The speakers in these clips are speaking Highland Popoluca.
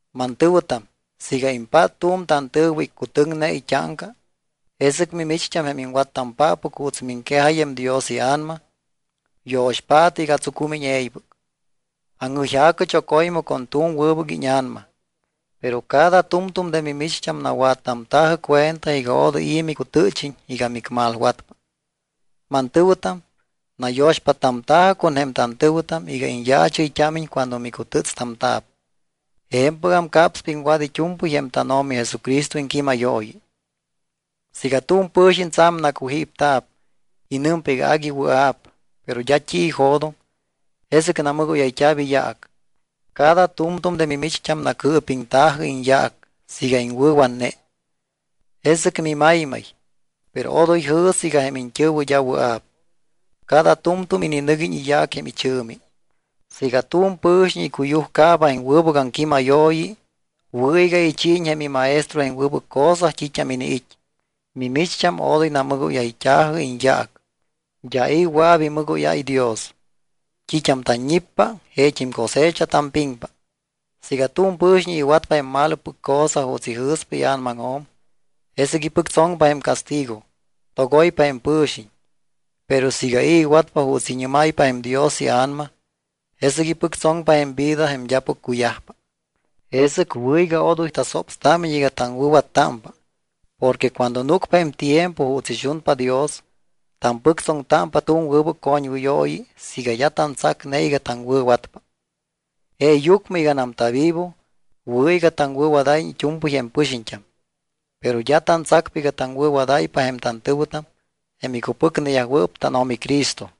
Mantɨ̱wɨtam, siiga impát tu̱m tantɨ̱wɨ iccutɨŋne it́áŋca, jesɨc mimicht́am, jém iŋwattampáppɨc juuts miŋquejáy jém Dios iA̱nama, yo̱xpaatɨ iga tsucúmiñ e̱ybɨc. Aŋjɨyja̱cɨ choco̱ymɨ con tu̱m wɨbɨc íña̱nama. Pero cada tu̱mtu̱m de mimicht́am nawattamta̱jɨ cuenta iga odoy i̱ micutɨ́chiñ iga micmalwatpa. Mantɨ̱wɨtam, nayo̱xpáttamta̱jɨ con jém tantɨ̱wɨtam iga iñyaachɨyt́ámiñ cuando micutɨ́tstamta̱p. Je̱mpɨgam capspa iŋwat it́u̱mpɨy jém tánO̱mi Jesucristo iŋquímayooyi. Siiga tu̱m pɨ̱xiñ tsa̱m nacujípta̱p y nɨmpa iga agui wɨa̱p, pero d́a t́i ijo̱doŋ, jesɨc namɨgóyayt́a̱p iyaac. Cada tu̱mtu̱m de mimicht́am nacɨɨpiŋta̱jɨ iñyaac. Siiga iŋwɨ̱watne, jesɨc mimaymay. Pero odoy jɨ̱sɨ iga jém iñt́ɨ̱wɨ d́a wɨa̱p. Cada tu̱mtu̱m ininɨguiñ iyaac jém ichɨ̱mi. Siiga tu̱m pɨ̱xiñ icuyujcaaba jém wɨbɨc aŋquímayooyi, wɨ̱ iga ichiiñ jém imaestro jém wɨbɨc cosa t́it́am iniit́. Mimicht́am odoy namɨgóyayt́a̱jɨ iñyaac. D́a i̱ wɨa̱p imɨgóyáy Dios. T́it́am tanñippa, jeet́im cosecha tampiŋpa. Siiga tu̱m pɨ̱xiñ iwatpa jém malopɨc cosa juuts ijɨ̱spa ia̱namaŋjo̱m, jesɨc ipɨctsoŋpa jém castigo. Togoypa jém pɨ̱xiñ. Pero siiga i̱ iwatpa juuts iñɨ́máypa jém Dios iA̱nama, jesɨc ipɨctsoŋpa jém vida jém d́apɨc cuyajpa. Jesɨc wɨ̱ iga odoy tasopstámiñ iga taŋwɨ̱wattámpa porque cuando núcpa jém tiempo juuts ixunpa Dios, tampɨctsoŋtámpa tu̱m wɨbɨc coñwɨyooyi siiga d́a tantsacne iga taŋwɨ̱watpa. Jeeyucmɨ iganam tavivo, wɨ̱ iga taŋwɨ̱wadáyiñ it́u̱mpɨy jém pɨxiñt́am, pero d́a tantsacpa iga taŋwɨ̱wadáypa jém tantɨ̱wɨtam jém icupɨcneyajwɨɨp tánO̱mi Cristo.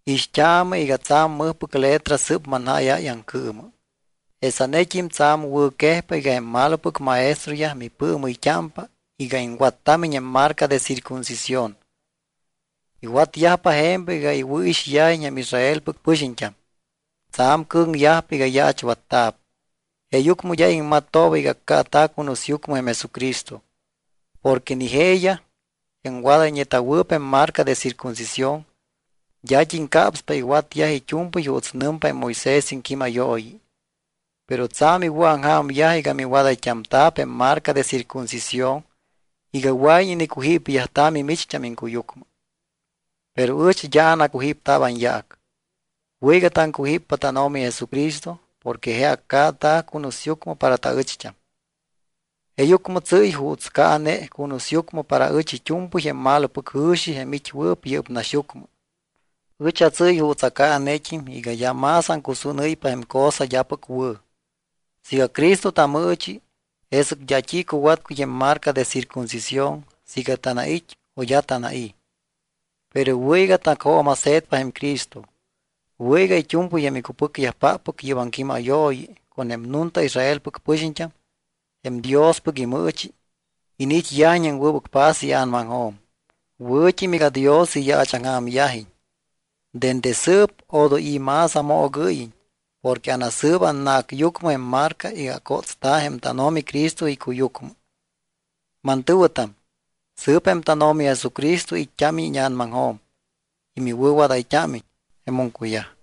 Ixt́aamɨ iga tsa̱m mɨjpɨc letra sɨ́p manjáyáy aŋcɨɨmɨ. Jesanet́im tsa̱m wɨ̱quejpa iga jém malopɨc maestroyaj mipɨɨmɨyt́ámpa iga iŋwattámiñ jém marca de circuncisión. Iwatyajpa je̱mpɨc iga iwɨ̱ixyajiñ jém Israelpɨc pɨxiñt́am. Tsa̱m cɨ̱ŋyajpa iga yaachwatta̱p, jeeyucmɨ d́a iŋmattooba iga accaata̱ cunusyucmɨ jém Jesucristo. Porque ni jeeyaj, jém wadayñeta̱wɨɨp jém marca de circuncisión, d́at́im capspa iwatyaj it́u̱mpɨy juuts nɨmpa jém Moisés iŋquímayooyi. Pero tsa̱m iwɨ̱aŋja̱myaj iga miwadayt́amta̱p jém marca de circuncisión iga wɨa̱iñ inicujípyajta̱ mimicht́am iŋcuyucmɨ. Pero ɨch d́a anacujípta̱p anyaac. Wɨ̱ iga taŋcujíppa tánO̱mi Jesucristo porque je accaata̱ cunusyucmɨ para taɨcht́am. Jeeyucmɨ tsɨ́y juuts caane cunusyucmɨ para ɨch it́u̱mpɨy jém malopɨc jɨ̱xi jém it́wɨɨp yɨ́p naxyucmɨ. Ɨch atsɨ́y juuts acaanet́im iga d́a más aŋcusúnɨ́ypa jém cosa d́apɨc wɨ̱. Siiga Cristo tamɨɨchi, jesɨc d́a t́i cuwatcuy jém marca de circuncisión siiga tanait́ o d́a tanai̱. Pero wɨ̱ iga tacjooma̱se̱tpa jém Cristo. Wɨ̱ iga it́u̱mpɨy jém icupɨcyajpáppɨc yɨ́p aŋquímayooyi, con jém nunta Israelpɨc pɨxiñt́am, jém Diospɨc imɨɨchi, iniit́yajiñ jém wɨbɨc paz ia̱namaŋjo̱m. Wɨ̱t́im iga Dios iyaachaŋja̱myajiñ. Dende sɨɨp odoy i̱ más amoogɨ́yiñ porque anasɨɨba annacyucmɨ jém marca iga acótsta̱ jém tánO̱mi Cristo icuyucmɨ. Mantɨ̱wɨtam, sɨɨp jém tánO̱mi Jesucristo it́t́ámiñ íña̱namaŋjo̱m y miwɨ̱wadayt́ámiñ. Jemum cuyaj.